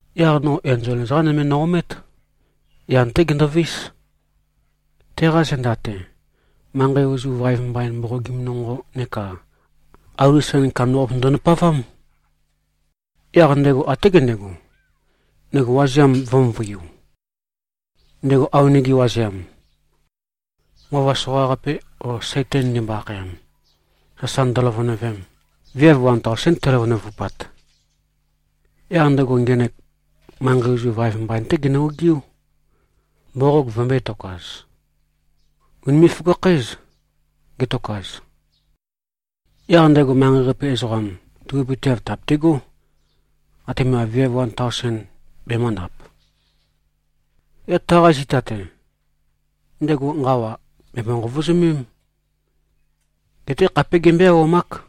Yaq no enzol ezoqa nøme no-omét. Yan-té gendovís. Teqa zenda-te, manqei ozu vaev mbain mboqogim nonqo neka auli sen kandambaqape ndø-ndapavám. Yaq ndego até gendego, ndego wazeam vø̄-møvøiu, ndego awenege wazeam, Nqova Soqaqape o Saitan ndimbo-akhayam, sasa ndøløvønøvem. Viav wan taosén teløvønøvupat. Yaq ndego ngenek manqei ozu vaev mbain-té genø-ogiú, mboqog vømbø̄e-tokaz. Ùnime꞉-føgakhǽz, getokaz. Yaq ndego manqei-qape ezoqam tubøpøteav tèabetegó, atema viav wan taosen bemø̄ndap. Yaq taqa zita-te, ndego nqawa bèmbo-nqovozømém. Geté khapé gembøé-auwamák.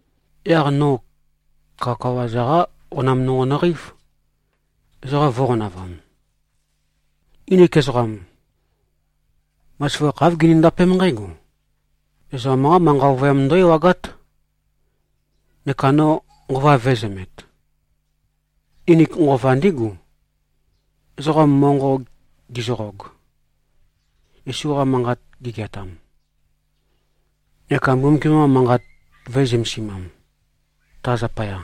Yaq no kawakawa-za-qa qonam nonqo nøqeív, ezoqa vō꞉qonavam. Nginik ezoqam, bazaføgakh, āv ginindapém nqǽgo: Ezoqam-qá manqa ovøyam ndǿ-ewagát. Neka no nqova vø̄ezømet. Nginik nqova ndígu, ezoqam monqo gizøqog, Yesu-qa manqat gigeatam neka Mbumbukiam-qa Manqat vø̄e-zømesimam, ta zapaya.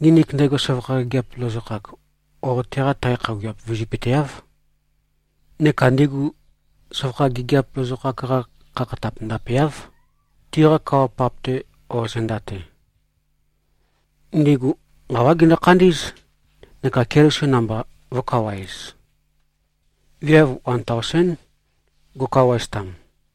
Nginik ndego søvakha gigiap lozokhak o teqa tae khøuwiap vizøpøteáv, neka ndigu søvakha gigiap lozokhak-qa khakhatap ndapeáv, tiqa kawa-pap-te o zenda-te. Ndigu nqawá gindu-khandí꞉z, neka Keliso namba vō꞉kawaez. Viav wan taosén go꞉kawaeztam.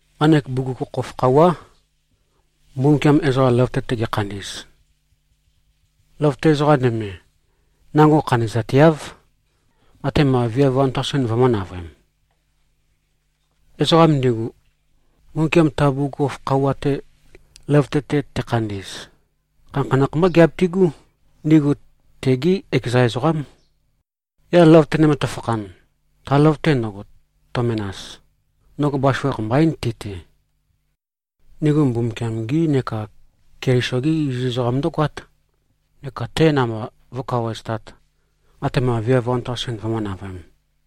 Nqanek bugukhokhof khøuwá, Mbumbukiam ezoqa løvøte-te gekhandi꞉z. Løvøte ezoqa nøme, nango khandi꞉zateáv, atema viav wan taosen vømø̄-navøem. Ezoqam ndigu, Mbumbukiam ta bugukhokhof khøuwa-te løvøte-te tekhandi꞉z, khanakhanakh mbá giabitigú. Ndigu tegí ekeza ezoqám. Yaq løvøte nøme tøfakhan, ta løvøte ndøgo, tø-menas, ndøgo bazaføgakh mbaín, ti-te. Ndigu Mbumbukiam-gi neka Keliso-gi iziz ezoqam ndǿgoát, neka te namba vó꞉kawaeztāt, atema viav wan taosen vømǿ-navøēm.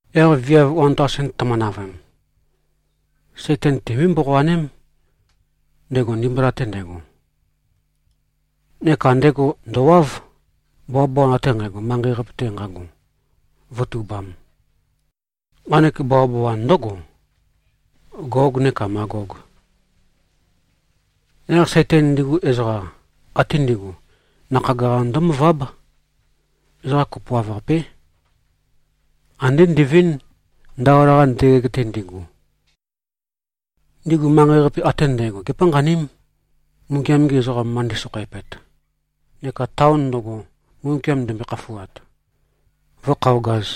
Yaq viav wan taosen tømø-navøem, Saitan timbøé-mboqoaném, ndego ndimbula-te ndego. Neka ndego ndø̀wáv, bawabawan ate nqægo, manqei-qape-te nqago, vǿtubām. Nqanek bawabawan ndǿgo, Gog neka Magog. Yaq Saitan ndigu ezoqa ate ndi꞉gu, nakhag-qa ndǿmøváb. Ezoqa kopoav-qapé. Andé ndivínd, ndaola-qa ndøgeg-te ndigu. Ndigu manqei-qape ate ndægo gépanqaním, Mbumbukiam-gi ezoqam, ma ndi꞉sokhoeapet, neka taon ndøgo, Mbumbukiam ndembøe-khafuat, vǿkhøogāz.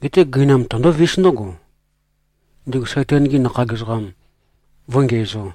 Geté gøinam tøndóvís ndǿgo, ndigu Saitan-gi nakhag ezoqam vǿngiæzō.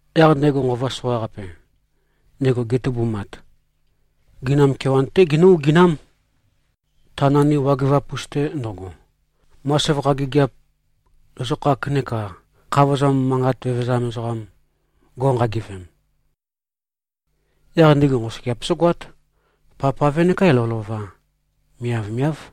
Yaq ndego nqova soqaqape, ndego getubumat, gøinam kewan-té ginǿ-oginám, ta nandi wagøvap-us-te ndøgo, ma søvakha gigiap lozokhak neka khavozam manqa vevezam ezoqam, go꞉nqagivem. Yaq ndigu nqosøgeap zǿgoát, pavpave nekā lovølova. Miavmiáv.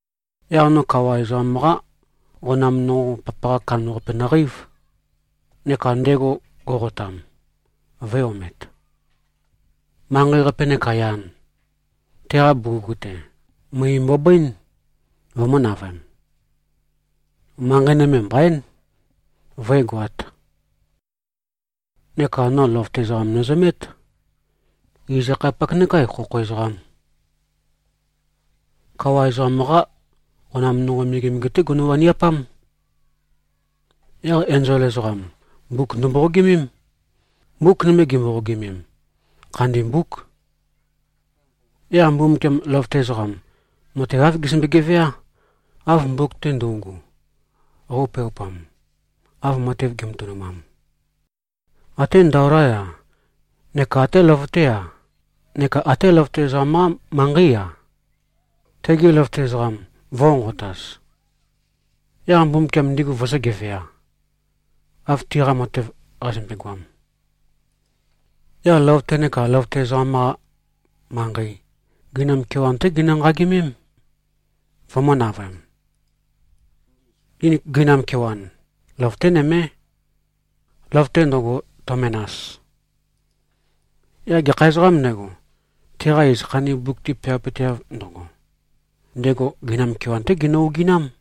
Yaq no kawa ezoqam-qa qonam nonqo papaqa kandambaqape nøqeív, neka ndego go꞉qotam, vø̄e-omet. Manqei-qape neka yan, teqa bugug-te, møe mbobøín, vømø̄-navøem. Manqei nøme mbaín, vǿegoāt. Neka no løvøte ezoqam nøzømét, iz-akhayapak nekā khokho ezoqam. Kawa ezoqam-qá qonam nonqo megemege-té gono-waniapám. Yaq enzol ezoqam, mbuk ndømboqogimém. Mbuk nøme gimboqogimem, khandi mbúk. Yaq Mbumbukiam, løvøte ezoqam, matev, āv gezømbe-geveá, av mbuk-te ndøugu qøupeaupam, av matev gi꞉matønumam. Até ndaolá-ya neka até løvøté-a neka até løvøte ezoqam-qá manqeí-a, tigi løvøte ezoqam vø̄nqonqotaz, yaq Mbumbukiam ndigu vøzø̄-gevea, av tiqa matev qazømbe-goam. Yaq løvøte neka løvøte ezoqam-qa manqei, gøinam kewan-té ginø-nqagimém, vømø̄-navøem. Nginik gøinam kewan, løvøté nømé, løvøte ndøgo, tø-menas. Yaq gekha ezoqām ndego, teqa iz khandi mbuk-te peawapøteav ndøgo, ndego gøinam kewan-té ginø-oginám.